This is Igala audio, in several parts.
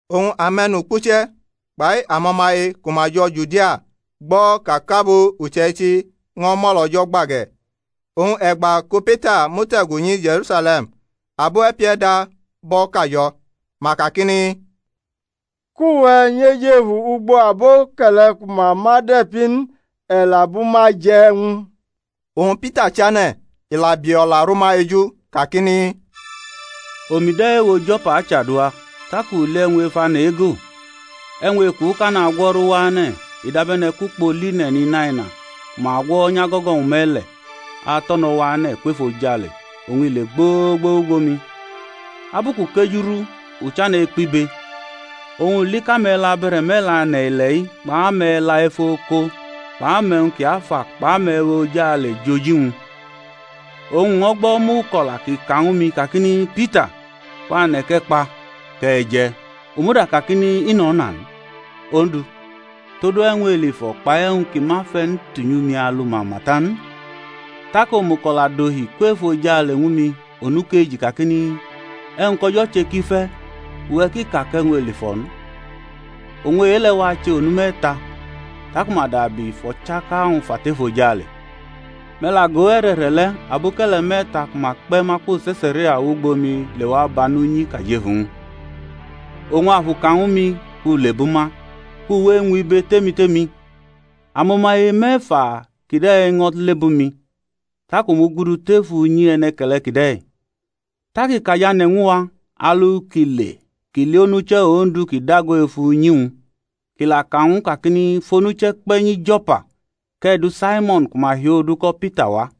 Oñ ame̩nukpuche̩ kpai amo̩maye ku ma jo̩ Judia gbo̩ ka kʼabo uche̩ichi ño̩ mʼo̩lO̩jo̩ gba ge̩. Oñ e̩gba ku Pita mute̩gu nyi Je̩rusale̩m abo e̩pie̩da bʼo̩ kajo̩, ma kakini, Kʼuwe̩ nyʼejefu ugbo aboke̩le̩ ku ma ma de̩pi n, e̩ la bʼuma je̩ e̩wñ. Oñ Pita chane̩, i la bi o̩la ru ma eju kakini, Omi de̩ ewo Jo̩pa achadua, tak u li e̩wñ ef ane̩ ego, e̩wñ ekuʼka nagwo̩ru wane̩, i dabe̩ne̩ kʼukpo line̩n inaina ku ma gwo̩nyʼago̩go̩-wñ me̩le̩ ato̩no̩ wane̩ kwʼefojale oñ i le gbogbo wʼugbo mi. Abu kʼu kejurʼu u chane̩ ekpibe, oñ u li kʼame̩la abe̩re̩me̩le̩ ane̩ ile̩-i kpʼame̩la ef o̩ko̩ kpʼame̩wñ ki afa kpʼame̩we̩ ojale jʼoji-wñ. Oñ u ño̩ gbo̩ omuko̩la kʼi ka ñwu-mi, kakini, Pita, kwane̩ kʼe̩ kpa kʼe̩ je̩. U muda kakini, I nʼo̩na n, Ondu, todu e̩wñ elifo̩ kpai e̩wñ ki ma fe̩ n tunyu mi alu mama ta n. Tak omuko̩la dohi kwʼefojale ñwu mi onukeji kakini, E̩wñ kʼO̩jo̩ che ki fe̩ uwe̩ ki ka kʼe̩wñ elifo̩ n. Oñ e-le̩ wache onu me̩ta, taku ma dabi fʼo̩chaka-wñ fa tʼefojale. Me̩ la go! e̩re̩re̩ le̩, aboke̩le̩ me̩ta ku ma kpe̩ ma kwo Se̩saria wʼugbo mi lewa banʼunyi kʼa jʼefu-wñ. Oñ Afu ka ñwu mi kʼu lebʼuma, kʼu we eñwʼibe tʼemi tʼemi. Amo̩maye me̩fa kide̩ ño̩ lebʼumi, tak a mugudu tef unyi e̩ne̩ke̩le̩ kide̩. Tak i kajane̩ ñwu wa alu ki le kʼi li onuche̩ Ondu ki dago ef unyi-wñ, kʼi la ka ñw u kakini, Fʼonuche̩ kpe̩ nyi Jo̩pa, kʼe̩ du Saimo̩n ku ma hiʼodu ko̩ Pita wa,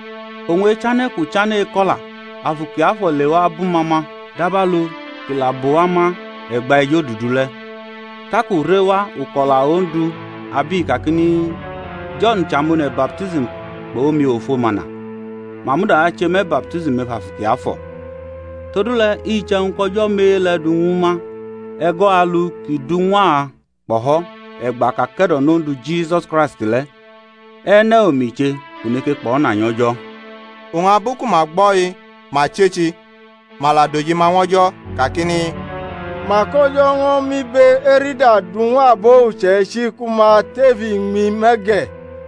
Oñ echane̩ kʼu chane̩ eko̩la Afu Kiafo̩ lewa bʼuma ma dabalu kʼi la bʼuwa ma e̩gba ejodudu le̩. Tak u rewa uko̩la Ondu, abʼi kakini, Jo̩n che amone̩ baptism kpʼomiofo mana, ma muda ache me̩ baptism ef Afu Kiafo̩. Todule̩ iche̩wñ kʼO̩jo̩ mʼe-ʼle̩ du ñwu ma e̩go̩ alu kʼi du ñw a kpo̩ho̩ e̩gba kʼa ke̩do̩nʼOndu Jisus Kraisti le̩, e̩ne̩ omi che kʼu neke kpo̩na nyʼO̩jo̩? Oñ abu ku ma gbo̩-i ma chechi, ma la dʼojima ñw O̩jo̩ kakini, Mak O̩jo̩ ño̩ mʼibe-erida du ñw abo uche̩ichi ku ma tef iñmi me̩ ge̩!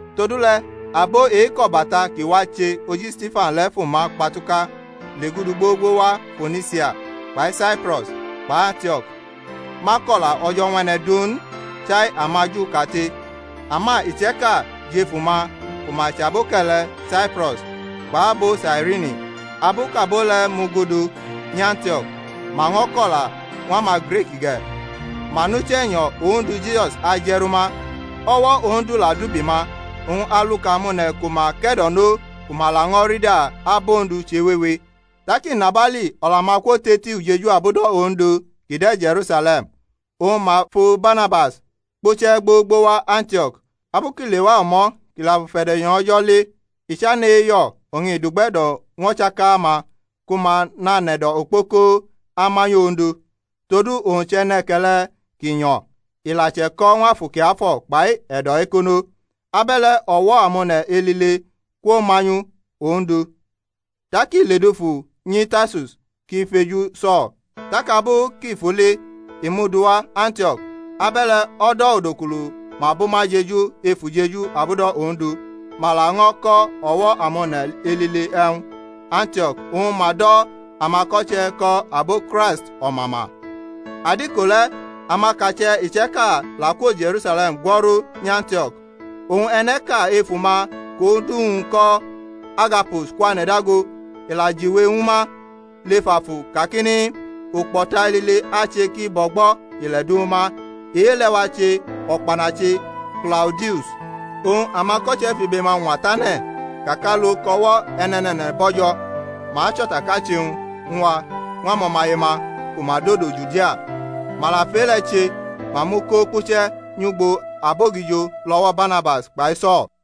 Todule̩ abo e-kʼo̩bata ki wache oji Stifan le̩ fʼuma kpatuka legudu gbogbo wa Fonisia kpai Saipro̩s kpʼAntio̩k, ma kʼo̩la O̩jo̩ ñw e̩ne̩ du n, chai amaJu kate. Ama iche̩ka jʼefu-ma ku ma chʼaboke̩le̩ Saipro̩s kpʼabo Sairini, abu kʼabo le̩ mugudu nyʼAntio̩k ma ño̩ ko̩la ñw amaGrik ge̩, ma nʼUche̩nyo̩ Ondu Jisus aje̩ru ma. O̩wo̩ Ondu la dʼubi-ma, oñ aluka amone̩ ku ma ke̩do̩no ku ma lafio rida abʼOndu chewewe. Tak inabali o̩la-ma kwotʼeli ujeju abudo̩ Ondu ki de̩ Je̩rusale̩m, oñ ma fu Barnabas kpuche̩ gbogbo wa Antio̩k. Abu kʼi lewa o̩mo̩ kʼi la fʼufe̩de̩nyo̩ O̩jo̩ li, i chane̩ eyo̩ oñ i dʼugbe̩do̩ ñw o̩chaka-ma ku ma nanʼe̩do̩ okpoko amanyʼOndu. Todu owñ chʼe̩ne̩ke̩le̩ ki nyo̩, i la che̩ko̩ ñw Afu Kiafo̩ kpai e̩do̩-ekono. Abe̩le̩ o̩wo̩ amone̩ elile kwomanyu ñw Ondu. Tak i ledufu nyi Tarsus kʼi feju So̩l. Tak abu kʼi fʼu li i mʼu duwa Antio̩k. Abe̩le̩ o̩do̩ odukulu ma bʼuma jeju ef ujeju abudo̩ Ondu, ma la ño̩ ko̩ o̩wo̩ amone̩ elile e̩wñ, Antio̩k oñ ma do̩ amako̩che̩ ko̩ abo Kraist o̩mama. Adiko le̩ amakache̩ iche̩ka la kwo Je̩rusale̩m gwo̩ru nyʼAntio̩k. Oñ e̩ne̩ʼka efu-ma kʼodu-wñ ko̩ Agabus kwane̩ dago, i la jiwe ñwu ma lef Afu kakini, Ukpo̩ta elile ache ki bʼo̩gbo ile̩ du ma, e-le̩ wache̩ o̩kpanachi Klaudius. Oñ amako̩che̩ fʼibe-ma ñwa tane̩ ka kʼalu kʼo̩wo̩ e̩ne̩ne̩ne̩ne̩ bo̩jo̩, ma achʼo̩takachi-wñ wa ñw amo̩maye-ma ku ma dodo Judia. Ma la fʼe-le̩ che, ma mʼu ko kpuche̩ nyʼugbo abogijo lʼo̩wo̩ Barnabas kpai So̩l.